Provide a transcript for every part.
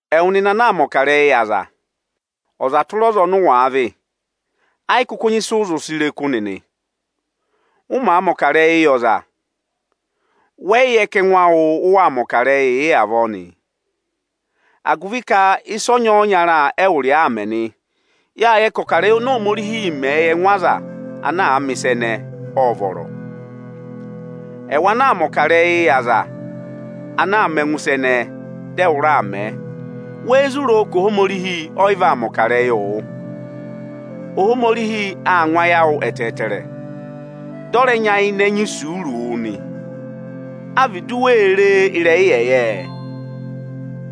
Ẹwụ nịnị ana aa mẹ̀ ọkarẹyị yị aza, ọza tụra ọza ọnị ụ wàa vị; ẹ yị kụkụ nyị ịsị u zụ re kụ́ nịnị. Ụ màa mẹ̀ ọkarẹyị yị ọza, wẹ yị yẹ ka ẹngụ awụ ụ waa mẹ̀ ọkarẹyị yị avọọ nịị! Agụvị ka ịsa ọnyọọnya ẹwụ rị ọọ aa mẹ nị. Yáa yẹ ka ọkarẹyị oni Ohomorihi mẹ yị ẹngụ aza ana mẹ̀ ịsa ẹnẹẹ, ọ́ọ vọrọ. Ẹwụ ana aa mẹ̀ ọkarẹyị yị aza ana aa mẹ ẹngụ ịsa ẹnẹẹ, dị ẹwụ raa mẹẹ, wéé zụ roo ka Ohomorihi ọ yị vaa mẹ̀ ọkarẹyị wụ? Ohomorihi aa ngụ ayị awụ ẹtẹẹtẹrẹ, dị ọ rẹ nyayịnẹ nyị isuuru wụ nị. A vị du wee ree ịrẹyị ịyẹyẹẹ?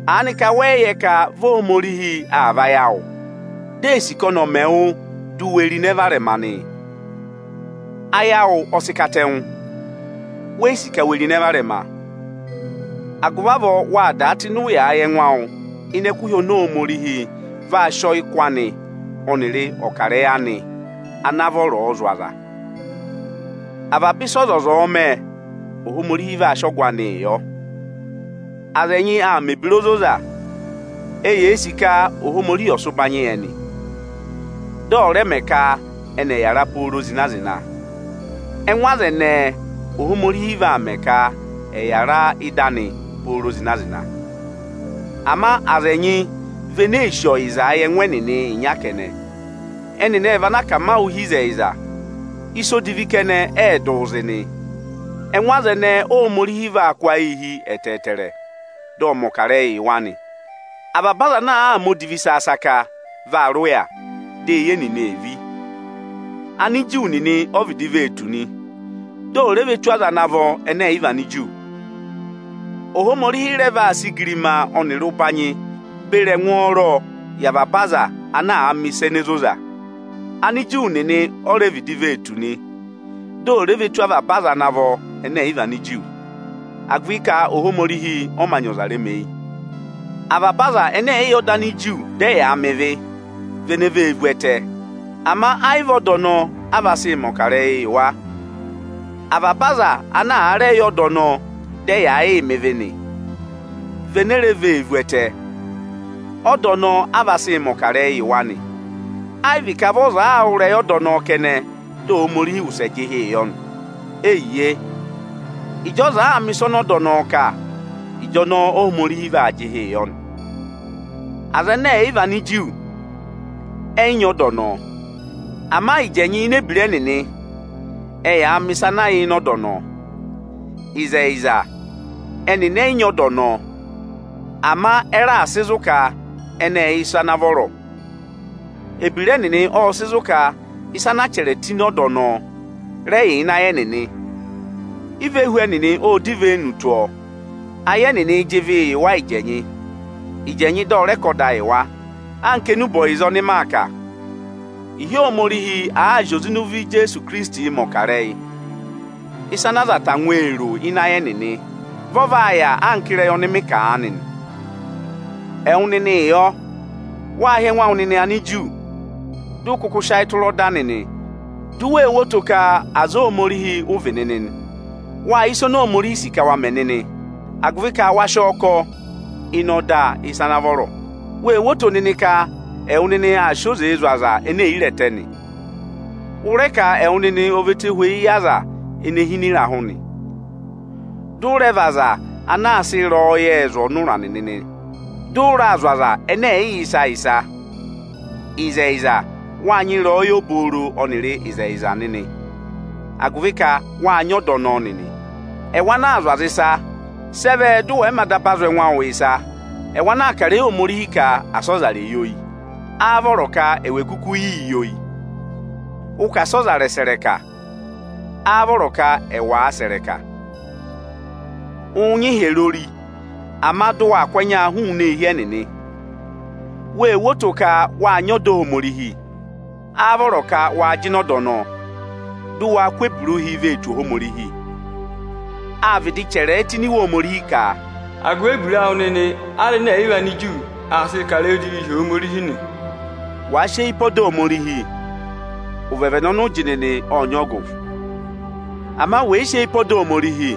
Aa nị ka wẹ yị yẹ ka vị Ohomorihi aa vayị awụ di ee sì ka ọnị ọ̀ mẹ wụ di u we ro ịnẹ varẹma nị? Ayị awụ ọ sị katẹngụ, weyi sì ka we ro ịnẹ varẹma. Agụvị avọọ waa dàa tụ́ ịnị ụyaa yị ẹngụ awụ ịnị ẹkụhị oni Ohomorihi vaa sị ọyị kụ anị ọnịrị ọkarẹyị anị ana vọrọọ zụ̀ aza. Avaba ịsị ọzọza ọ̀ọ mẹ, Ohomorihi vaa sị ọgụ anịị yọ. Aza ẹnyị aa mẹ̀ ebira ozoza. Eyee sì ka Ohomorihi ọ̀ sị ụbanyị yị ẹnị, dị ọ̀ rẹ mẹ ka ẹnị ẹ̀ yàra pooro zịna-zịna. Ẹngụ aza ẹnẹẹ, Ohomorihi vaa mẹ ka ẹ̀ yàra ị́da anị pooro zịna-zịna. Ama aza ẹnyị vị ene ee sì ọyịzaa yị ẹngụ ẹnịnị ịnya kẹnẹ. Ẹnịnị ẹ vị ana aa mẹ akamawụụ hi ịzẹyịza, ịsa odivi kẹnẹ ẹẹ̄ dụụ zị nị. Ẹngụ aza ẹnẹẹ, Óhomorihi vaa kụ́ ayịị hi ẹtẹẹtẹrẹ, dị ọ mẹ̀ ọkarẹyị yị wa nị. Avaba aza ana àa mẹ odivi saka-saka vaa rị ụya, di eyi ẹnịnị ee ví. Aniju nịnị o vịdị vee tù nị, di ò re ve tù aza ana vọ ẹnẹ ẹ̀ yị vị Aniju. Ohomorihi rẹ vaa sị igirima ọnịrị ụbanyị beri ẹngwọọrọọ yị avaba aza ana àa mẹ̀ ịsa ene zoza. Aniju nịnị o re vịdị vee tù nị, di ò re ve tù avaba aza ana vọ ẹnẹ ẹ̀ yị vị Aniju, agụvị ka Ohomorihi ọ mā nyị ọza remeyi. Avaba aza ẹnẹ ẹ̀ yị yẹ ọda Aniju dị ẹ yaa mẹ ịvị nị, vị ene vee vu ẹtẹ; ama ayị vị ọda ọnọọ, a vaa sị mẹ̀ ọkarẹyị yị wa. Avaba aza ana rẹ yẹ ọda ọnọọ dị ẹ yaa yịị mẹ ịvị nị, vị ene re vee vu ẹtẹ; ọda ọnọọ a vaa sị mẹ̀ ọkarẹyị yị wa nị. Ayị vị ka vị ọza aa wụ́ ịrẹyị ọda ọnọọ kẹnẹ, dị Ohomorihi wụsẹ jị ịhị yọ nị. Eyiye, ịjị ọza àa mẹ̀ ịsa ọnị ọda ọnọọ kà, ịjọnọọ Ohomorihi vaa jị ịhị yọ nị. Aza ẹnẹ ẹ̀ yị vị Aniju, ẹ yị nyị ọda ọnọọ. Ama ịjẹnyị ịnị ebira ẹnịnị, ẹyaa mẹ̀ ịsa ana yà ịnị ọda ọnọọ. Ịzẹyịza, ẹnịnị ẹ yị nyị ọda ọnọọ, ama ẹ raà sị zụ̀ ka ẹnị ẹ́ẹ yẹ ịsa ana vọrọ. Ebira ẹnịnị ọ́ọ sị zụ̀ ka ịsa anaa chẹrẹ tụ́ ịnị ọda ọnọọ, rẹ yà ịnị ayị ẹnịnị. Ivehu ẹnịnị ọ́ọ dọ ivenu tụ́ ọọ. Ayị ẹnịnịị̄ jị ịvịị yị wa ịjẹnyị, ịjẹnyị dị ọ rẹ kà ọda yị wa. Anka enube ọyịza ọnị maa kà ịhị Ohomorihi àaa zị oze ịnị ụvọ Ijeesu Ikirisiti mẹ̀ ọkarẹyị, ịsa ana aza tangwa ee ro ịnị ayị ẹnịnị, vị ọ vaa yà anka ịrẹyị ọnị mị kà aanị nị. Ẹwụ nịnịị yọ? Waa hị́ ẹngụ awụ nịnị Aniju, dị ụ kụkụ sị ayị tụra ọda nịnị, du wee wo oto ka aza Ohomorihi ụ vị nịnị nị. Wáa yẹ ịsị Ohomorihi sì ka waa mẹ nịnị, agụvị ka wa sị ọọ kọ ịnị ọda ịsa ana vọrọ. Wee wo oto nịnị ka ẹwụ nịnị aa sị oze zụ̀ aza ene è yi re ẹtẹ nị. Ụ rẹ ka ẹwụ nịnị ọ vị ẹtohweyi yị aza ene hi ịnị ịrahụ nị; dị ụ rẹ vị aza ana aa sị ịrẹyọyẹẹ zụ̀ ọnụra nịnị nị; dị ụ raa zụ̀ aza ẹnẹ ẹ̀ yị yẹ ịsa. Ịzẹyịza, wáa nyị ịrẹyọyẹ obooro ọnịrị ịzẹyịza nịnị, agụvị ka wáa nyị ọda ọnọọ nịnị. Ẹwụ ana aa zụ̀ aza ịsa, sị ẹ vẹ dị ẹwụ àa mā daba zụ̀ ẹngụ ẹwụ ịsa? Ẹwụ ana aa kà ịrẹyị Ohomorihi ka asị ọza rè yi oyi, áá vọrọ ka ẹwụ è kukuu yii yi oyi? Ụ ka asị ọza rẹ̀ sẹ̀ ịrẹka, áá vọrọ ka ẹwụ áá sẹ̀ ịrẹka? Ụụ̄ nyị ịhyẹrẹ ori, ama dị waa kụ́ ẹnyaa hụụnị eehi ẹnịnị. Wee wo oto ka wáa nyị ọda Ohomorihi, áá vọrọ ka wa jịnẹ ọda ọnọọ, dị waa kụ́ ebira ụhị vee tù Ohomorihi? Áa vịdị chẹrẹẹ tụ́ ini Iwe Ohomorihi ka, “Agụvị ebira awụ nịnị Anigiriki aa sịị kà ịrẹyị odivii hi Ohomorihi nị.” Wàa sị eyi pe ọda Ohomorihi, ụvẹvẹnẹ ọnị ụ jị nịnị ọ́ọ nyị ọgụ. Ama wẹ̀ yị sị eyi pe ọda Ohomorihi,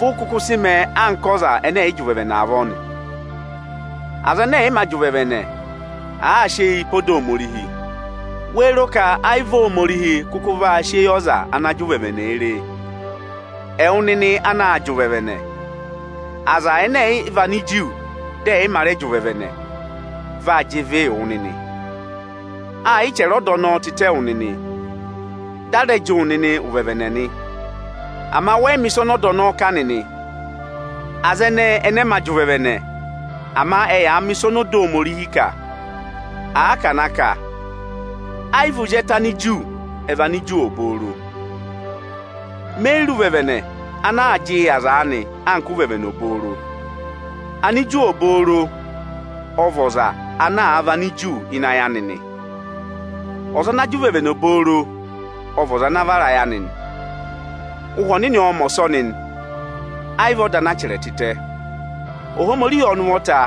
vụ ụ kụkụ sị mẹẹ anka ọza ẹnẹ ẹ̀ yị jị ụvẹvẹnẹ avọọ nị. Aza ẹnẹ ẹ̀ yị mā jị ụvẹvẹnẹ, àaa sị eyii pe ọda Ohomorihi, wéé ro ka ayị vị Ohomorihi kụkụ vaa sị eyi ọza anaā jị ụvẹvẹnẹ re e? Ẹwụ nịnị anaā jị ụvẹvẹnẹ, Anigiriki dị ẹ̀ yị mā rẹ jị ụvẹvẹnẹ vaa jị ịvịị wụ nịnị. A yị chẹrẹ ọda ọnọọ tịtẹ wụ nịnị, dị a rẹ jị wụ nịnị ụvẹvẹnẹ nị; ama wẹ yị mẹ̀ ịsa ọnị ọda ọnọọ kà nịnị. Aza ẹnẹẹ ẹnị ẹ mā jị ụvẹvẹnẹ, ama ẹ yaa mẹ̀ ịsa ọnị ọda Ohomorihi kà. Àa ka à na kà, ayị vị ozi ẹtẹ Aniju ẹ vị Aniju obooro. Me yi re ụvẹvẹnẹ ana aā jịị yị aza aanị anka ụvẹvẹnẹ obooro. Aniju obooro ọ vị ọza ana vị Aniju ịnị ayị anị nị. Ọza ana jị ụvẹvẹnẹ obooro ọ vị ọza ana vara ayị anị nị. Ụhwẹ Ọnịnị ọọ̄ mẹ̀ ọsọnị nị, ayị vị ọda anaa chẹrẹ tịtẹ. Ohomorihi ọnị ụvọta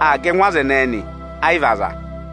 aa ga ẹngụ aza ẹnẹẹ nị, ayị vị aza.